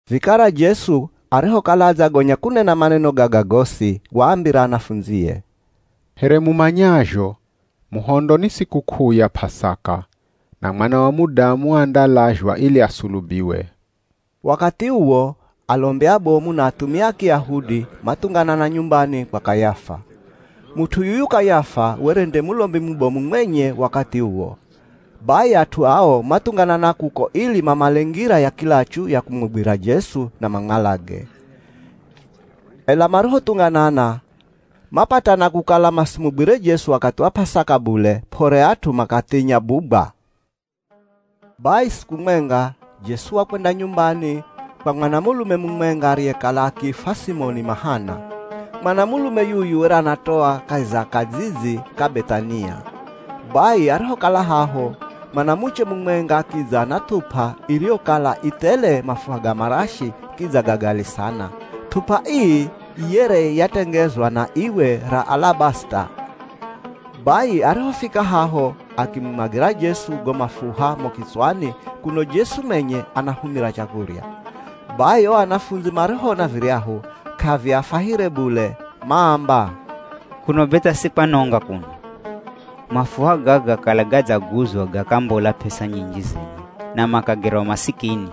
Vikara Jesu arihokala adzagonya kunena maneno gaga gosi, waambira anafundzie, “Here mumanyazho, muhondo ni sikuk'uu ya P'asaka. Na Mwana wa Mudamu andalazhwa ili asulubiwe.” Wakathi uwo, alombi abomu na athumia a Kiyahudi mathunganana nyumbani kwa Kayafa. Mut'u yuyu Kayafa were nde Mulombi mubomu mwenye wakathi uwo. Bai at'u ao mathunganana kuko ili mamale ngira ya kilachu ya kumugwirira Jesu na mamwalage. Ela marihothunganana, mapatana kukala masimugwire Jesu wakathi wa P'asaka bule, p'ore at'u makathinya bugwa. Bai siku mwenga, Jesu wakwenda nyumbani kwa mwanamulume mumwenga ariyekala akiifwa Simoni Mahana. Mwanamulume yuyu were anatoa kahi za kadzidzi ka Beth'ania. Bai arihokala haho, mwanamuche mumwenga akidza na th'up'a iriyokala i thele mafuha ga marashi kidza ga gali sana. Th'up'a ii yere yatengezwa na iwe ra alabasita. Bai arihofika haho, akimumwagira Jesu go mafuha mo kitswani kuno Jesu mwenye anahumira chakurya. Bai o anafundzi marihoona viryahu, k'aviafwahire bule, maamba, “Kuno be tha si kwanonga kuno? Mafuha gaga kala gadzaguzwa gakambola p'esa nyinji zenye na makagerwa masikini?”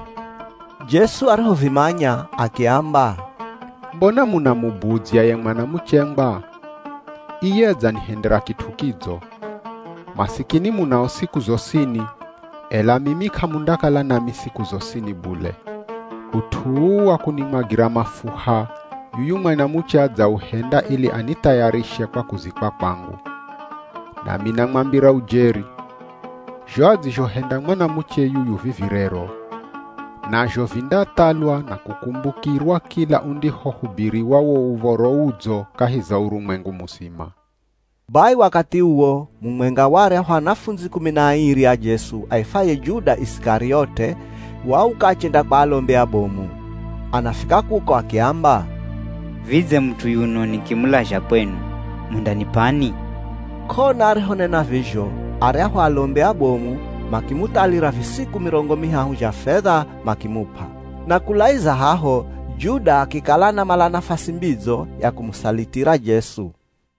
Jesu arihovimanya akiamba, “Mbona munamubudzya ye mwanamuchengwa? Iye adzanihendera kit'u kidzo. Masikini munao siku zosini, ela mimi k'amundakala nami siku zosini bule. Ut'u uu wa kunimwagira mafuha, yuyu mwanamuche adzauhenda ili anithayarishe kwa kuzikwa kwangu. Nami namwambira ujeri, zho adzizhohenda mwanamuche yuyu vivi rero, nazho vindathalwa na kukumbukirwa kila undihohubiriwa wo Uv̱oro Udzo kahi za urumwengu muzima.” Bai wakathi uwo, mumwenga wa aryahu anafundzi kumi na airi a Jesu aifwaye Juda Isikariote, wauka achenda kwa alombi abomu. Anafika kuko akiamba, “Vidze mut'u yuno nikimulazha kwenu, mundanip'ani?” K'ona arihonena vizho, aryahu alombi abomu makimuthalira visiku mirongo mihahu zha fedha makimup'a. Na kulaizira haho, Juda akikala anamala nafasi mbidzo ya kumusalitira Jesu.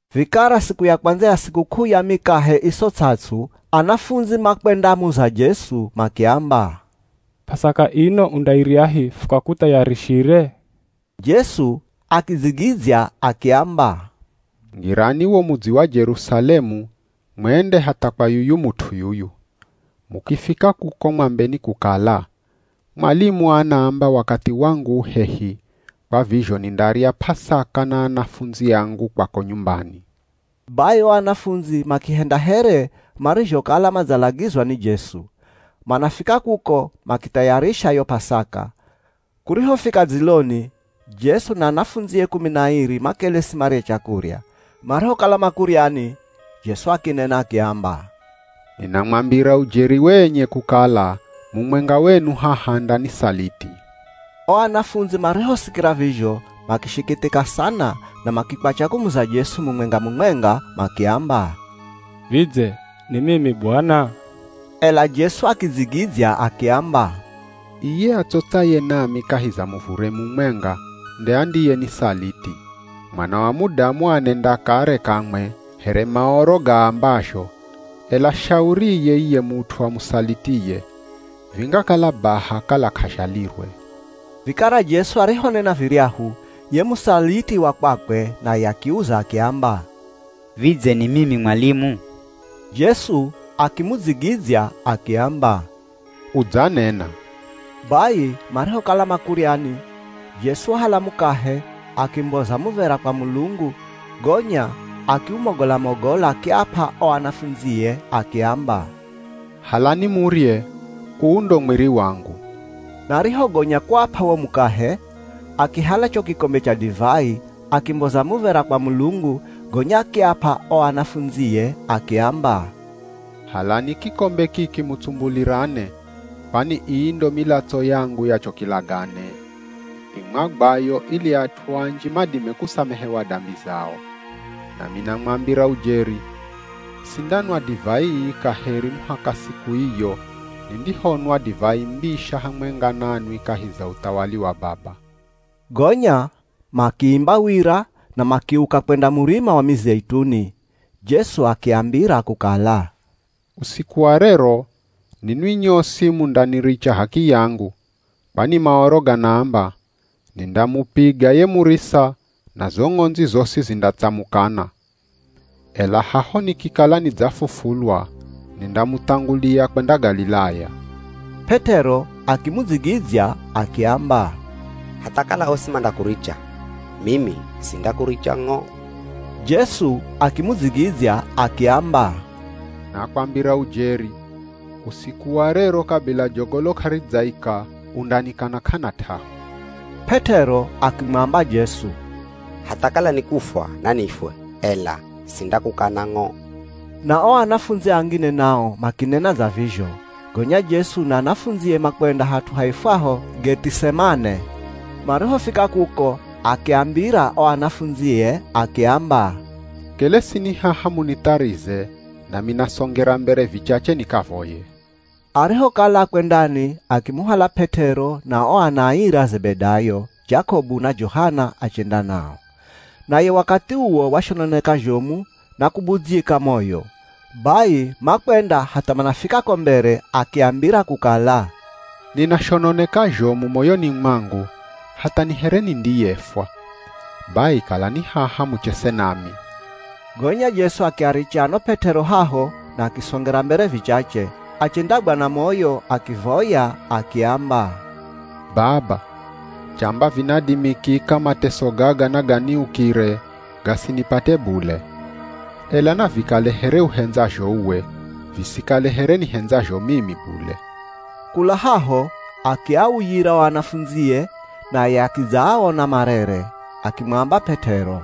Vikara siku ya kwandza ya sikuk'uu ya Mikahe Iso Ts'ats'u, anafundzi makwendamuza Jesu makiamba, “P'asaka ino undairyahi, fukakuthayarishire?” Jesu akidzigidzya akiamba, “Ngirani wo mudzi wa Jerusalemu mwende hatha kwa yuyu mut'u yuyu. Mukifika kuko mwambeni kukala, ‘Mwalimu anaamba wakathi wangu u hehi, kwa vizho nindarya P'asaka na anafundzi angu kwako nyumbani.’” Bai o anafundzi makihenda here marizhokala madzalagizwa ni Jesu. Manafika kuko makithayarisha yo P'asaka. Kurihofika dziloni, Jesu na anafundzie kumi na airi makelesi marye chakurya. Marihokala makuryani Jesu akinena akiamba, “Ninamwambira ujeri wenye kukala mumwenga wenu haha andanisaliti.” O anafundzi marihosikira vizho makishikithika sana na makikwacha kumuza Jesu mumwenga-mumwenga makiamba, “Vidze ni mimi, Bwana?” Ela Jesu akidzigidzya akiamba, “Iye atsotsaye nami kahi za muvure mumwenga nde andiyenisaliti. Mwana wa Mudamu anenda kare kamwe here Maoro gaambazho, ela shauriye iye mut'u amusalitiye! Vingakala baha kala k'azhalirwe.” Vikara Jesu arihonena viryahu, ye musaliti wa kwakwe naye akiuza akiamba, “Vidze ni mimi Mwalimu?” Jesu akimudzigidzya akiamba, “Udzanena.” Bai marihokala makuryani, Jesu wahala mukahe, akimboza muv̱era kwa Mulungu, gonya akiumogola-mogola akiap'a o anafundzie akiamba, “Halani murye, uu ndo mwiri wangu.” Na arihogonya kuap'a wo mukahe, akihala cho kikombe cha divai, akimboza muv̱era kwa Mulungu, gonya akiap'a o anafundzie akiamba, “Halani kikombe kiki mutsumbulirane, kwani ii ndo milatso yangu ya cho kilagane, imwagwayo ili at'u anji madime kusamehewa dambi zao. Nami namwambira ujeri, sindanwa divai ii kaheri muhaka siku iyo nindihonwa divai mbisha hamwenga nanwi kahi za uthawali wa Baba.” Gonya makiimba wira na makiuka kwenda Murima wa Mizeituni. Jesu akiambira kukala, “Usiku wa rero, ninwi nyosi mundaniricha h'akiyangu. Kwani Maoro ganaamba, ‘Nindamupiga ye murisa na zo ng'ondzi zosi zindatsamukana.’ Ela haho nikikala nidzafufulwa, nindamuthangulia kwenda Galilaya.” P'et'ero akimudzigidzya akiamba, “Hatha kala osi mandakuricha, mimi sindakuricha ng'o.” Jesu akimudzigidzya akiamba, “Nakwambira ujeri, usiku wa rero kabila jogolo k'aridzaika, undanikana k'ana t'ahu.” P'et'ero akimwamba Jesu, “Hatha kala ni kufwa nanifwe, ela sindakukana ng'o!” Na o anafundzi angine nao makinena dza vizho. Gonya Jesu na anafundzie makwenda hat'u haifwaho Geth'isemane. Marihofika kuko, akiambira o anafundzie akiamba, “Kelesini haha munitharize nami nasongera mbere vichache nikavoye.” Arihokala akwendani akimuhala P'et'ero na o ana airi a Zebedayo, Jakobu na Johana achenda nao. Naye wakathi uwo washononeka zhomu na kubudzyika moyo. Bai makwenda hatha manafika ko mbere, akiambira kukala, “Ninashononeka zhomu moyoni mwangu hatha ni here nindiyefwa. Bai kalani haha muchese nami.” Gonya Jesu akiaricha ano P'et'ero haho na akisongera mbere vichache. Achendagwa na moyo akivoya akiamba, “Baba, chamba vinadimikika mateso gaga naganiukire, gasinipate bule. Ela navikale here uhendzazho uwe, visikale here nihendzazho mimi bule.” Kula haho akiauyira o anafundzie, naye akidzaaona marere. Akimwamba P'et'ero,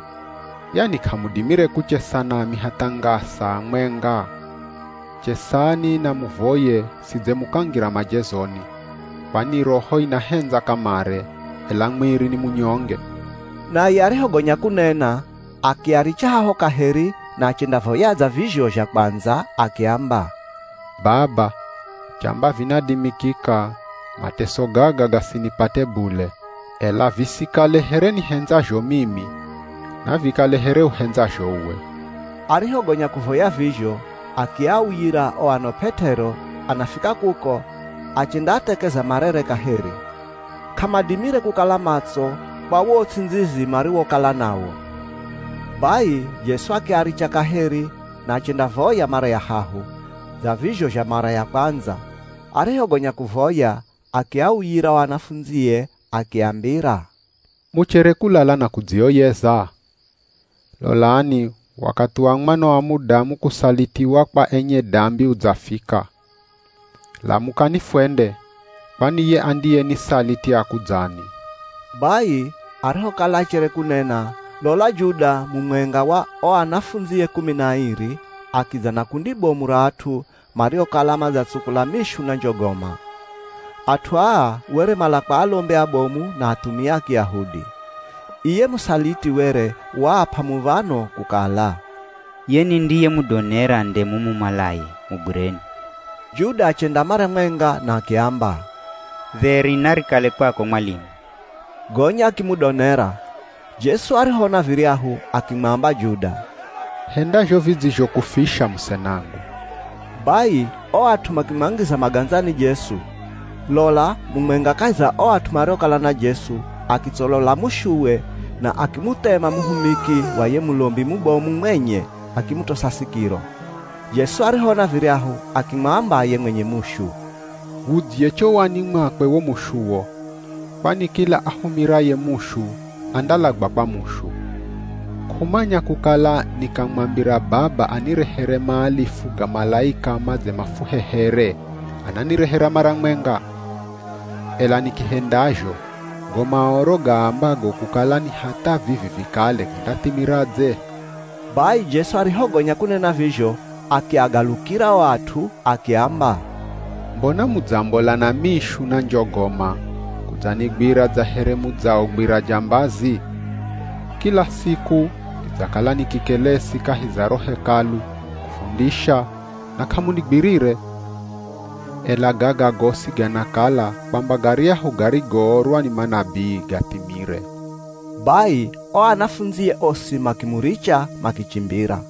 “Yani k'amudimire kuchesa nami hatha ngaa saa mwenga? Chesani na muvoye sidze mukangira majezoni, kwani roho inahendza kamare, ela mwiri ni munyonge.” Naye arihogonya kunena, akiaricha haho kaheri na achendavoya dza vizho zha kwandza akiamba, “Baba, chamba vinadimikika, mateso gaga gasinipate bule. Ela visikale here nihendzazho mimi, navikale here uhendzazho uwe.” Arihogonya kuvoya vizho, akiauyira o ano P'et'ero. Anafika kuko, achendaathekeza marere kaheri. K'amadimire kukala matso kwa wo uts'indzizi mariwokala nawo. Bai Jesu akiaricha kaheri, na achendavoya mara ya hahu, dza vizho zha mara ya kwandza. Arihogonya kuvoya, akiauyira o anafundzie akiambira, “Muchere kulala na kudzioyeza? Lolani wakathi wa Mwana wa Mudamu kusalitiwa kwa enye dambi udzafika. Lamukani fwende, kwani ye andiyenisaliti akudzani.” Bai arihokala achere kunena, lola Juda mumwenga wa o anafundzie kumi na airi akidza na kundi bomu ra at'u mariokala madzatsukula mishu na njogoma. At'u aa were mala kwa alombi abomu na athumia a Kiyahudi. Iye musaliti were waap'a muv̱ano kukala, “Ye nindiyemudonera nde mumumalaye, mugwireni.” Juda achenda mara mwenga na akiamba, “Dheri narikale kwako Mwalimu,” gonya akimudonera. Jesu arihoona viryahu, akimwamba Juda, “Henda zho vidzizhokufisha musenangu.” Bai o at'u makimwangiza magandzani Jesu. Lola mumwenga kahi za o at'u mariokala na Jesu, akitsolola mushuwe na akimuthema muhumiki wa ye Mulombi mubomu mwenye akimutosa sikiro. Jesu arihoona viryahu, akimwamba ye mwenye mushu, “Wudzye chowani mwakwe wo mushuwo. Kwani kila ahumiraye mushu, andalagwa kwa mushu. K'umanya kukala nikamwambira Baba anirehere maalifu ga malaika madze mafuhehere, ananirehera mara mwenga? Ela nikihendazho, go Maoro gaambago kukala ni hatha vivi vikale gandathimiradze?” Bai Jesu arihogonya kunena vizho, akiagalukira o at'u akiamba, “Mbona mudzambola na mishu na njogoma kudzanigwira dza here mudzaogwira jambazi? Kila siku nidzakala nikikelesi kahi za ro Hekalu kufundisha na k'amunigwirire? Ela gaga gosi ganakala kwamba garyahu garigoorwa ni manabii gathimire.” Bai o anafundzie osi makimuricha makichimbira.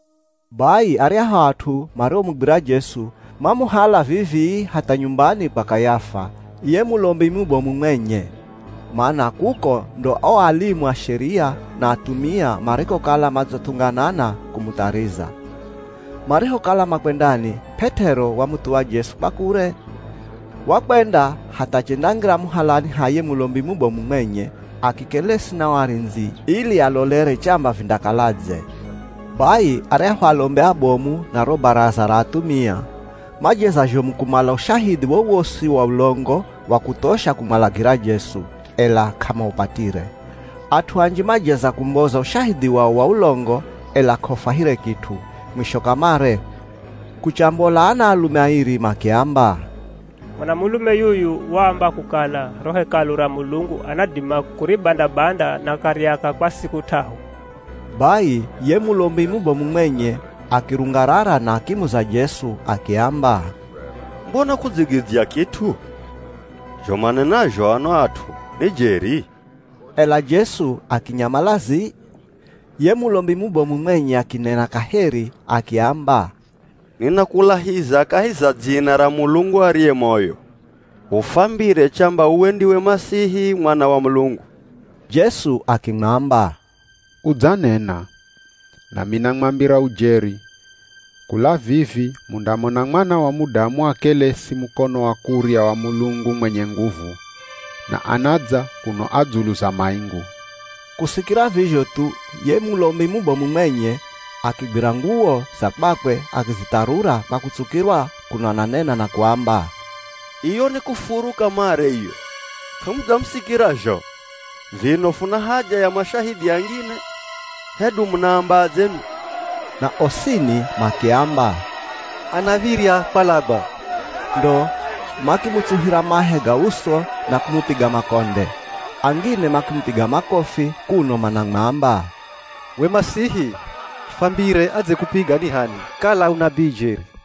Bai aryahu at'u mariomugwira Jesu, mamuhala vivii hatha nyumbani kwa Kayafa, ye Mulombi mubomu mwenye, mana kuko ndo o alimu a Sheria, na athumia marikokala madzathunganana kumuthariza. Marihokala makwendani, P'et'ero wamuthuwa Jesu kwa kure. Wakwenda hatha achendangira muhalani ha ye Mulombi mubomu mwenye, akikelesi na o arindzi ili alolere chamba vindakaladze. Bai aryahu alombi abomu na ro Baraza ra athumia, majeza zhomu kumala ushahidhi wowosi wa ulongo wa kuthosha kumwalagira Jesu, ela k'amaupatire. At'u anji majeza kumboza ushahidhi wao wa ulongo, ela k'aufwahire kit'u. Mwisho kamare, kuchambola anaalume airi makiamba, “Mwanamulume yuyu waamba kukala ro Hekalu ra Mulungu anadima kuribanda-banda na akariaka kwa siku t'ahu.” Bai ye Mulombi mubomu mwenye akirungarara, na akimuza Jesu akiamba, “Mbona k'udzigidzya kit'u. Zho manenazho ano at'u ni jeri?” Ela Jesu akinyamala zii. Ye Mulombi mubomu mwenye akinena kaheri akiamba, “Ninakulahiza kahi za dzina ra Mulungu ariye moyo, ufwambire chamba uwe ndiwe Masihi Mwana wa Mulungu.” Jesu akimwamba, “Udzanena. Nami namwambira ujeri, kula vivi mundamona Mwana wa Mudamu akelesi mukono wa kurya wa Mulungu mwenye nguvu, na anadza kuno a dzulu za maingu.” Kusikira vizho thu, ye Mulombi mubomu mwenye akigwira nguwo za kwakwe akizitharura kwa kutsukirwa, kuno ananena na kuamba, “Iyo ni kufuru kamare iyo. K'amudzamusikira zho? Vino funa haja ya mashahidhi angine? Hedu munaambadze nwi?” Na osini makiamba, “Anav̱irya kwalagwa.” Ndo makimutsuhira mahe ga uso na kumupiga makonde. Angine makimupiga makofi, kuno manamwamba, “We Masihi, fwambire adzekupiga ni h'ani kala u nabii jeri!”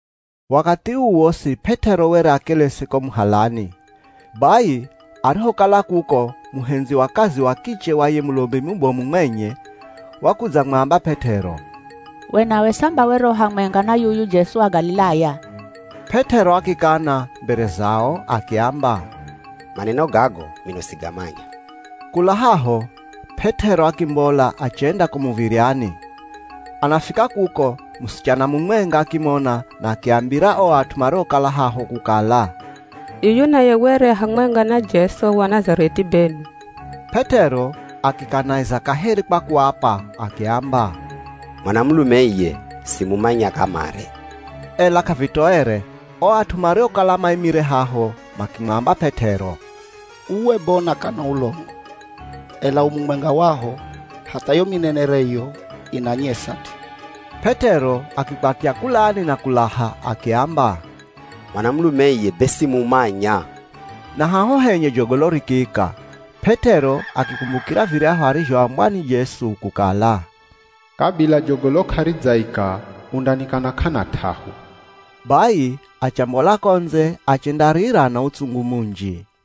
Wakathi uu wosi P'et'ero were akelesi ko muhalani. Bai arihokala kuko muhendzi wa kazi wa kiche wa ye Mulombi mubomu mwenye wakudzamwamba P'et'ero, “We nawe samba were u hamwenga na yuyu Jesu wa Galilaya?” P'et'ero akikana mbere zao akiamba, “Maneno gago mino sigamanya.” Kula haho, P'et'ero akimbola achenda ko muv̱iryani. Anafika kuko, musichana mumwenga akimona na akiambira o at'u mariokala haho kukala, “Yuyu naye were a hamwenga na Jesu wa Nazareth'i benwi.” P'et'ero akikanaiza kaheri kwa kuapa akiamba, “Mwanamulume iye simumanya kamare.” Ela k'avitoere, o at'u mariokala maimire haho makimwamba P'et'ero, “Uwe be unakana ulongo, ela u mumwenga waho. Hatha yo minenereyo inanyesa t'i.” P'et'ero akikwatya kulani na kulaha, akiamba, “Mwanamulume iye be simumanya.” Na haho henye jogolo rikiika. P'et'ero akikumbukira viryahu arizhoambwa ni Jesu kukala, “Kabila jogolo k'aridzaika undanikana k'ana t'ahu.” Bai achambola ko ndze achendarira na utsungu munji.